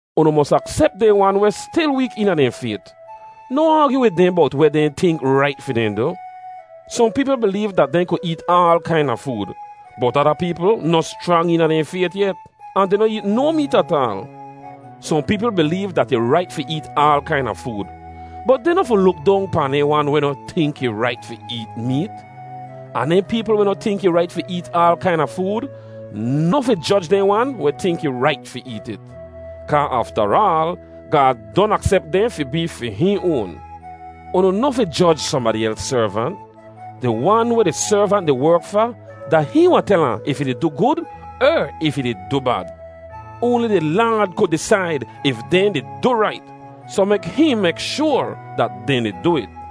Unu mos aksep dehn wan weh stil week eena dehn fayt. Noh aagyu wid dehn bowt weh dehn tink rait fi dehn du. Sohn peepl bileev dat dehn ku eet aal kaina food, bot ada peepl noh schrang eena dehn fayt yet, ahn dehn noh eet no meet ataal. Sohn peepl bileev dat ih rait fi eet aal kaina food, bot dehn noh fi luk dong pahn dehn wan weh noh tink ih rait fi eet meet. Ahn dehn peepl weh noh tink ih rait fi eet aal kaina food noh fi joj dehn wan weh tink ih rait fi eet it. Kaa aftaraal Gaad don aksep dehn fi bee fi hihn oan. Unu noh fi joj sohnbadi els servant. Di wan weh di servant di werk fa, da hihn wahn tel ahn if ih di du gud er if ih di du bad. Oanli di Laad ku disaid if dehn di du rait, soh mek hihn mek shoar dat dehn di du it.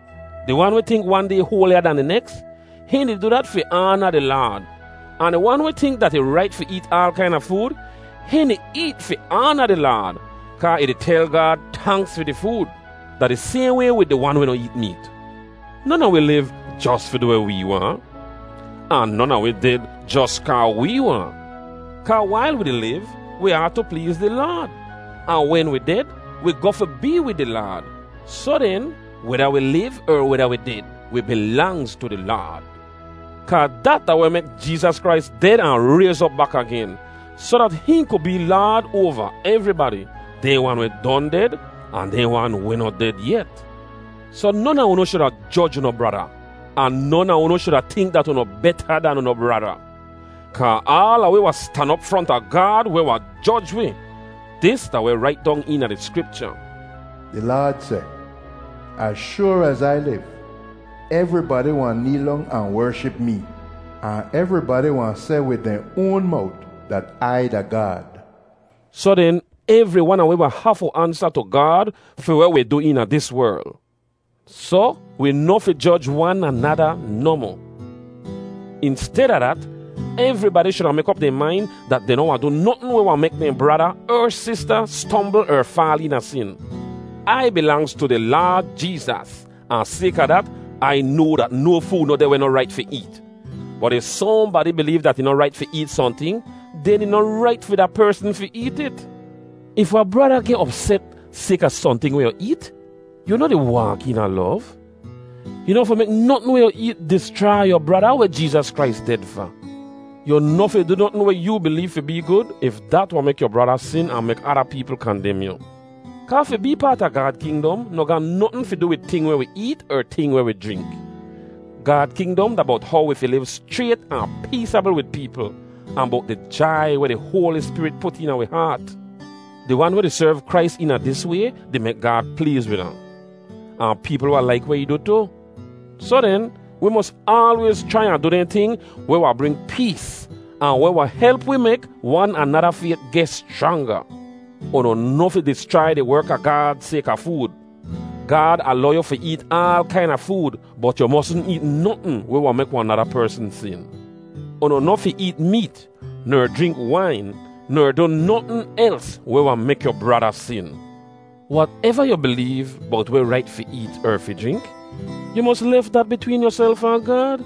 Di wan weh tink wan day hoaliya dan di neks, hihn di du dat fi aana di Laad. Ahn di wan weh tink dat ih rait fi eet aal kaina food, hihn di eet fi aana di Laad, kaa ih di tel Gaad tanks fi di food. Da di sayhn way wid di wan weh noh eet meet. Non a wi liv jos fi du weh wee waahn, ahn non a wi ded jos kaa wee waahn. Kaa wail wi di liv wi aatu pleez di Laad. Ahn wen wi ded, wi goh fi bee wid di Laad. Soh den, weda wi liv er weda wi ded, wi bilangz tu di Laad. Kaa dat da weh mek Jeezas Krais ded ahn rayz op bak agen, soh dat hihn ku bee Laad oava evribadi, dehn wan weh don ded, ahn dehn wan weh noh ded yet. Soh non a unu shuda joj unu brada. Ahn non a unu shuda tink dat unu beta dan unu brada. Kaa aala wi wahn stan op fronta Gaad weh wahn joj wi. Dis da weh rait dong eena di Skripcha: “Di Laad seh, ‘Az shoar az Ai liv, evribadi wahn neel dong ahn wership mee, Ahn evribadi wahn seh wid dehn oan mowt dat Ai da Gaad.’” Soh den, evri wan a wi wahn hafu ansa tu Gaad fi weh wi du eena dis werl. Soh, wi noh fi joj wan anada nohmoh. Insteda dat, evribadi shuda mek op dehn main dat dehn noh wahn du notn weh wahn mek dehn brada er sista stombl er faal eena sin. Ai bilangz tu di Laad Jeezas, ahn sayka dat, Ai noa dat no food noh deh weh noh rait fi eet. Bot if sohnbadi bileev dat ih noh rait fi eet sohnting, den ih noh rait fi da persn fi eet it. If wahn brada geh opset sayka sohnting weh yu eet, yu noh di waak eena lov. Yu noh fi mek notn weh yu eet dischrai yu brada weh Jeezas Krais ded fa. Yu noh fi du notn weh yoo bileev fi bee gud if dat wahn mek yu brada sin ahn mek ada peepl kandem yu. Kaa fi bee paat a Gaad kingdom noh ga notn fi du wid ting weh wi eet er ting weh wi jrink. Gaad kingdom da bowt how wi fi liv schrayt ahn peesabl wid peepl, ahn bowt di jai weh di Hoali Spirit put eena wi haat. Di wan weh di serv Krais eena dis way di mek Gaad pleez wid ahn, ahn peepl wahn laik weh ih du tu. Soh den, wi mos aalwayz chrai ahn du dehn ting weh wahn bring pees ahn weh wahn help wi mek wan anada fayt geh schranga. Unu noh fi dischrai di werk a Gaad sayka food. Gaad alow yu fi eet aal kaina food, bot yu mosn eet notn weh wahn mek wahn nada persn sin. Unu noh fi eet meet ner jrink wain ner du notn els weh wahn mek yu brada sin. Wateva yu bileev bowt weh rait fi eet er fi jrink, yu mos lef dat bitween yuself ahn Gaad.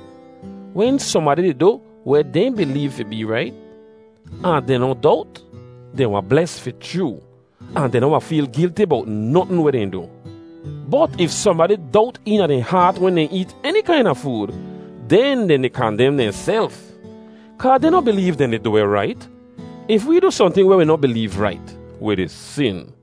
Wen sohnbadi di du weh dehn bileev fi bee rait, ahn dehn noh dowt, dehn wahn bles fi chroo, ahn dehn noh wahn feel gilti bowt notn weh dehn du. Bot if sohnbadi dowt eena dehn haat wen dehn eet eni kaina food, den dehn di kandem dehnself, kaa dehn noh bileev dehn di du weh rait. If wee du sohnting weh wi noh bileev rait, wi di sin.